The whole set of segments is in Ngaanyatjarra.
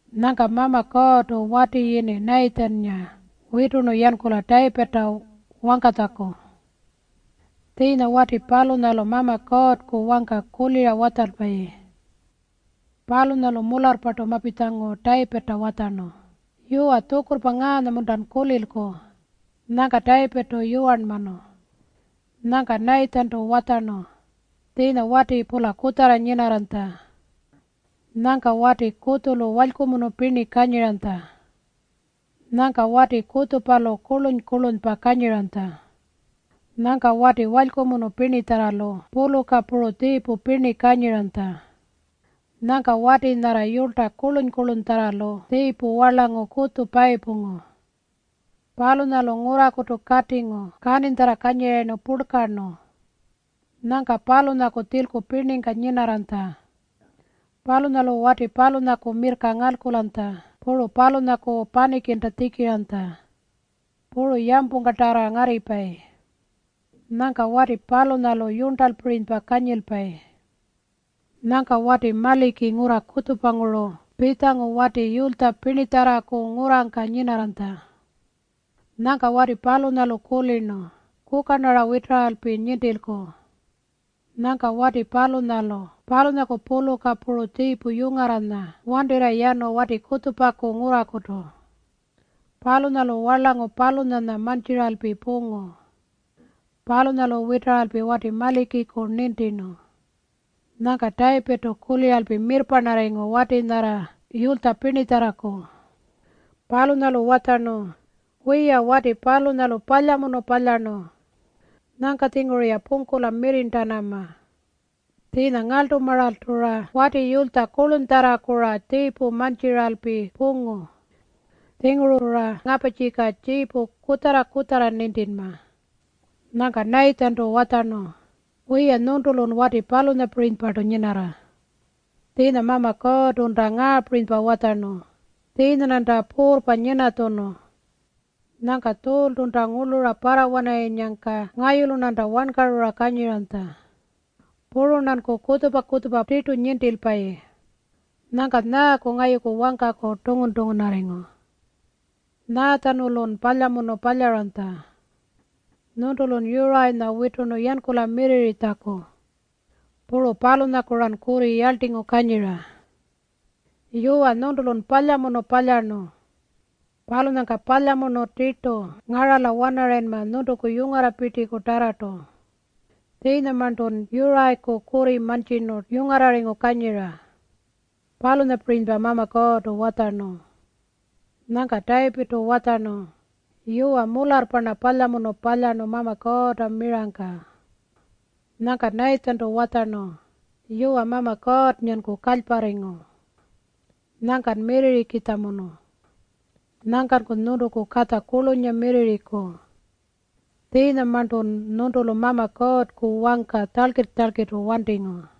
Nyangka Mama Kuurrtu wati yini Nayitjinnga witurnu yankula Tayipirrta wangkatjaku. Tjiinya wati palunyalu Mama Kuurrku wangka kulira watjalpayi. Palunyalu mularrpartu mapitjangu Tayipirrta watjarnu, “Yuwa, tjukurrpa ngaanya-muntan kulilku?” Nyangka Tayipirrtu yuwarnmanu. Nyangka Nayitjintu watjarnu, “Tjiinya wati-pula kutjarra nyinarranytja. Nyangka wati kutjulu walykumunu pirni kanyiranytja. Nyangka wati kutjupalu kurluny-kurlunypa kanyiranytja. Nyangka wati walykumunu pirnitjarralu puluka puru tjiipu pirni kanyiranytja. Nyangka wati nyarra yulytja kurluny-kurlunytjarralu tjiipu warlangu kutju payipungu. Palunyalu ngurrakutu katingu kaninytjarra kanyirayirnu purlkarnu. Nyangka palunyaku tjilku pirningka nyinarranytja. Palunyalu wati palunyaku mirrka ngalkulanytja puru palunyaku panikinta tjikiranytja. Puru yampungkatarra ngarripayi. Nyangka wati palunyalu yurntalpirinypa kanyilpayi. Nyangka wati maliki ngurra kutjupanguru pitjangu wati yulytja pirnitjarraku ngurrangka nyinarranytja. Nyangka wati palunyalu kulirnu, ‘Kuka-rnara witaralpi nintilku.’ Nyangka wati palunyalu palunyaku puluka puru tjiipu yungarranya wantirra yanu wati kutjupaku ngurrakutu. Palunyalu warlangu palunyanya mantjiralpi pungu. Palunyalu witaralpi wati malikiku nintirnu.” Nyangka Tayipirrtu kuliralpi mirrparnarringu wati nyarra yulytja pirnitjarraku. Palunyalu watjarnu, “Wiya, wati palunyalu palyamunu palyarnu. Nyangka-tjinguru-ya pungkula mirrirntanama. Tjiinya ngarltumaaltu-ra wati yulytja kurlunytjarraku tjiipu mantjiralpi pungu. Tjinguru-ra ngaparrtjika tjiipu kutjarra-kutjarra nintinma.” Nyangka Nayitjintu watjarnu, “Wiya, nyuntulun wati palunyapirinypartu nyinarra. Tjiinya Mama Kuurrtunta ngaapirinypa watjarnu, ‘Tjiinya-rnanta puurrpa nyinatjunu. Nyangka Tjuultunta ngurlura parrawanarayinnyangka ngayulu-rnanta wankarura kanyiranytja. Puru-rnanku kutjupa-kutjupa tirtu nintilpayi. Nyangkan nyaaku ngayuku wangkaku tungun-tungunarringu? Nyaatjanulun palyamunu palyaranytja? Nyuntulun Yurayinya witurnu yankula mirrirritjaku. Puru palunyaku-ran kurri yarltingu kanyira. Yuwa, nyuntulun palyamunu palyarnu. Palunyangka palyamunu tirtu ngarala-wanarayinma nyuntuku yungarrapirtikutarrartu. Tjiinyamarntun Yurayiku kurri mantjirnu yungarrarringu kanyira.’ Palunyapirinypa Mama Kuurrtu watjarnu.” Nyangka Tayipirrtu watjarnu, “Yuwa, mularrpa-rna palyamunu palyarnu Mama Kuurrta mirangka.” Nyangka Nayitjintu watjarnu, “Yuwa, Mama Kuurrnganku kalyparringu. Nyangkan mirrirrikitjamunu. Nyangkanku nyuntuku katja kurlunynga mirrirriku. Tjiinyamarntun nyuntulu Mama Kuurrku wangka tjalkirr-tjalkirrtu wantingu.”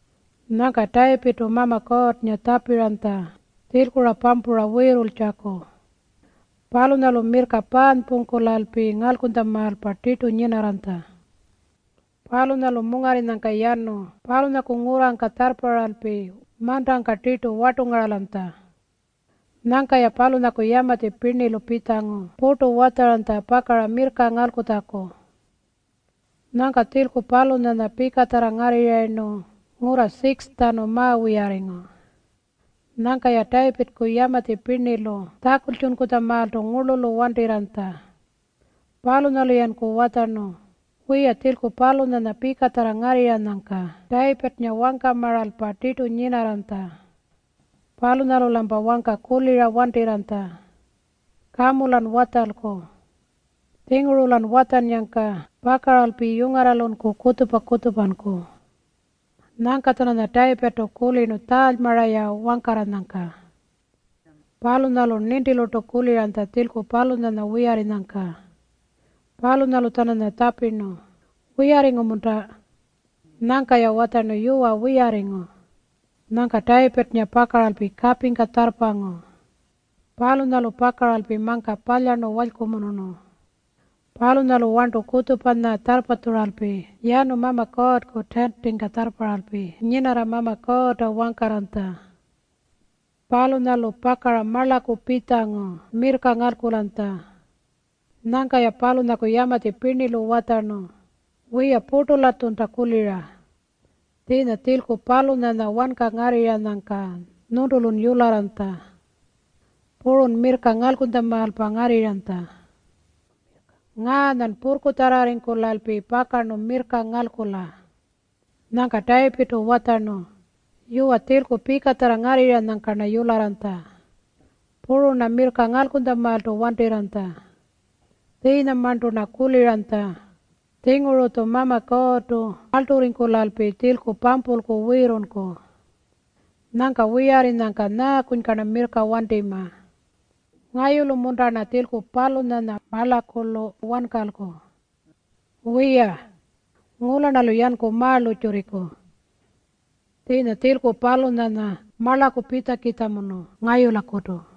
Nyangka Tayipirrtu Mama Kuurrnga tjapiranytja tjilku-ra pampura wiirrultjaku. Palunyalu mirrka paanypungkulalpi ngalkunytjamaalpa tirtu nyinarranytja. Palunyalu mungarrinyangka yanu palunyaku ngurrangka tjarrparralpi mantangka tirtu wartungaralanytja. Nyangka-ya palunyaku yamatji pirnilu pitjangu purtu watjaranytja pakara mirrka ngalkutjaku. Nyangka tjilku palunyanya pikatjarra ngarrirrayirnu ngurra 6-tjanu ma-wiyarringu. Nyangka-ya Tayipirrku yamatji pirnilu tjakultjunkutjamaaltu ngurlulu wantirranytja. Palunyalu-yanku watjarnu, “Wiya, tjilku palunyanya pikatjarra ngarrirranyangka Tayipirrnga wangkamaalpa tirtu nyinarranytja. Palunyalu-lampa wangka kulira wantirranytja. Kamu-lan watjalku. Tjinguru-lan watjannyangka pakaralpi yungarralunku kutjupa-kutjupanku.” Nyangka-tjananya Tayipirrtu kulirnu tjaalymara-ya wangkarranyangka. Palunyalu nintilurtu kuliranytja tjilku palunyanya wiyarrinyangka. Palunyalu-tjananya tjapirnu, “Wiyarringu-munta?” Nyangka-ya watjarnu, “Yuwa, wiyarringu.” Nyangka Tayipirrnga pakaralpi kapingka tjarrpangu. Palunyalu pakaralpi mangka palyarnu walykumunurnu. Palunyalu warntu kutjupanya tjarrpatjuralpi yanu Mama Kuurrku tiintingka tjarrparralpi nyinarra Mama Kuurrta wangkarranytja. Palunyalu pakara marlaku pitjangu mirrka ngalkulanytja. Nyangka-ya palunyaku yamatji pirnilu watjarnu, “Wiya, purtu-latjunta kulira. Tjiinya tjilku palunyanya wanka ngarrirranyangka nyuntulun yularranytja. Purun mirrka ngalkunytjamaalpa ngarrirranytja. Ngaanyan purrkutjarrarringkulalpi pakarnu mirrka ngalkula.” Nyangka Tayipirrtu watjarnu, “Yuwa, tjilku pikatjarra ngarrirranyangka-rna yularranytja. Puru-rna mirrka ngalkunytjamaaltu wantirranytja. Tjiinyamarntu-rna kuliranytja, ‘Tjinguru-tju Mama Kuurrtu ngarlturringkulalpi tjilku pampulku wiirrulku.’ Nyangka wiyarrinyangka nyaakunyka-rna mirrka wantima? Ngayulu-munta-rna tjilku palunyanya marlakulu wankalku? Wiya. Ngula-rnalu yanku ma-lurrtjurriku. Tjiinya tjilku palunyanya marlaku pitjakitjamunu ngayulakutu.”